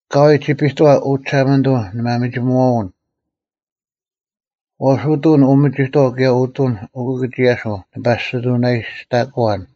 ᐊᑲᐎᔾ ᒋᐱᑐᐛ, ᐅ ᒋᓴᒪᓂᑐᐤ ᓂᒪᒥᒋᒧᐛᐅᓐ᙮ ᐛᔅ ᐅᑐᓐ ᐅᒥᒋᑥᐤ ᑭᔭ ᐅᑐᓐ ᐅᑭᑭᒋᔭᓯᐤ ᓂ ᐸᔅᒋᑐᓇᔨᔅᑕᑯᐛᓐ: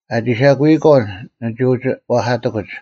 ᐊᒋ ᓴᒋᐃᒂᐤ ᓂᒋ ᐅᒋ ᐛᐧᑲᑎᑯᒡ: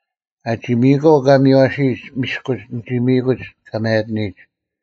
ᐊᒋ ᒥᔨᒂᐤ ᑲ ᒥᔽᓯᔨᒡ ᒥᔅᑯᒡ ᓂᒋ ᒥᔨᑯᒡ ᑲ ᒪᔭᑎᓂᔨᒡ,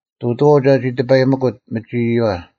ᑐᑐᐛᐤ ᒐᒋ ᑎᐸᔨᒥᑯᑦ ᒥᒋ ᐃᔪᐛ,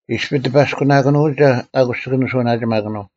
ᐃᔅᐱ ᑎᐸᔅᑯᓇᑭᓄᐅᒐ ᐊᑯᔅ ᒋᑭ ᓂᓱᐅᓇᒋᒪᑭᓄᐤ;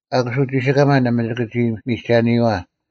ᐊᑯᔅ ᐅᒋᓯᑲᒪ ᓇᒪ ᒋᑭ ᒋ ᒥᒐᓂᔨᐛ;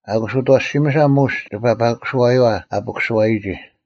ᐊᑯᔅ ᐅᑦ ᐊᐛᓯᒥᓴ ᒧᔅ ᒋᑭ ᐸᐸᑯᓱᐛᔪᐛ ᐊ ᐸᑯᓯᐛᔨᒋ: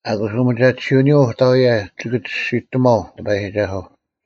ᐊᑯᔅ ᐅᒥᒐᑎᓯᐅᓂᔪᐤ ᐅᑕᐎᔭ ᒋᑭ ᒋᔅᒋᑎᒺᐤ ᑎᐸᔨᒋᒐᓱᐤ;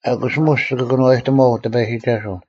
ᐊᑯᔅ ᒧᔅ ᒋᑭ ᑭᓄᐛᐸᑎᒺᐤ ᑎᐸᔨᒋᒐᓱᐤ,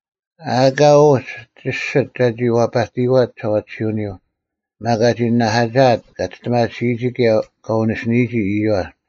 ᐊ ᐊᑲ ᐅᒡ ᒋᔅᒋᑦ ᒐᒋ ᐛᐸᑎᔨᐛᑦ ᒋᓴᐛᑎᓯᐅᓂᔪᐤ, ᒪᒃ ᐊᒋ ᓇᓇᐧᑲᒋᐊᑦ ᑲ ᒋᔅᑎᒪᒋᓯᔨᒋ ᑭᔭ ᑲ ᐅᓂᓯᓂᔨᒋ ᐃᔪᐛ,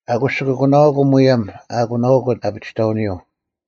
ᐊᑯᔅ ᒋᑭ ᐊᒂᓇᐅᑯᐤ ᒧᔭᒻ ᐊ ᐊᑯᓇᐅᑯᑦ ᐊᐱᒋᑕᐅᓂᔪᐤ,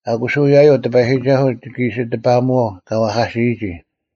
ᐊᑯᔅ ᐅᔭᔪᐤ ᑎᐸᔨᒋᒐᓱᐤ ᒋᑭ ᐃᓯ ᑎᐸᐅᒧᐛᐤ ᑲ ᐛᐧᑲᓯᔨᒋ,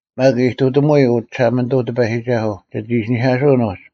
ᒪᒃ ᐃᑐᑎᒧᐎ, ᐅ ᒋᓴᒪᓂᑐᐤ ᑎᐸᔨᒋᒐᓱᐤ, ᒋᑦ ᐃᓯᓂᐧᑲᓱᐅᓐ ᐅᒡ: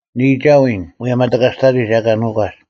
ᓂ ᐃᒐᐎᓐ ᒧᔭᒻ ᐊ ᑎᑲᔅᑕᑎᒡ ᐊ ᐊᑲ ᓄᒂᒡ: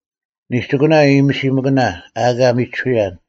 ᓂᒋᑯᓇ ᐃᔨᔨᒥᓯᒥᑭᓇ ᐊ ᐊᑲ ᒥᒋᓱᔭᓐ;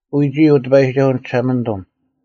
ᐎᒋᐃ, ᐅ ᑎᐸᔨᒋᒐᓱᐤ ᓂᒋᓴᒪᓂᑐᒻ: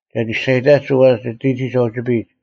ᒐᒋ ᒋᔅᒐᔨᑕᒡ ᐅᐛ ᒋᑎᒋᒡ ᐊ ᐅᒋᐱᔨᒡ;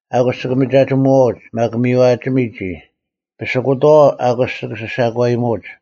ᐊᑯᔅ ᒋᑭ ᒪᒐᒋᒧᐛᐅᒡ, ᒪᒃ ᒥᔽᒋᒥ ᒋᔾ: ᐸᓯᑯᑥᐛ, ᐊᑯᔅ ᒋᑭ ᓯᓴᒂᔨᒧᐅᒡ;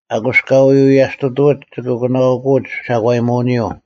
ᐊᑯᔅ ᑲ ᐎ ᐎᔭᔅᑐᑐᐅᒡ ᒋᑭ ᐊᒂᓇᐅᑯᐅᒡ ᓴᒂᔨᒧᐅᓂᔪᐤ;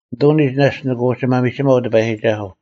ᓂᑐᓂᒡ ᓇᔅᒡ ᓂᑭ ᐅᒋ ᒪᒥᒋᒪᐤ ᑎᐸᔨᒋᒐᓱᐤ;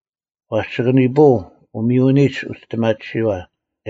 ᐛᔅ ᒋᑭ ᓂᐳᐤ ᐅᒥᔪᓂᔨᒡ ᐅᒋᔅᑎᒪᑎᓯᐛ,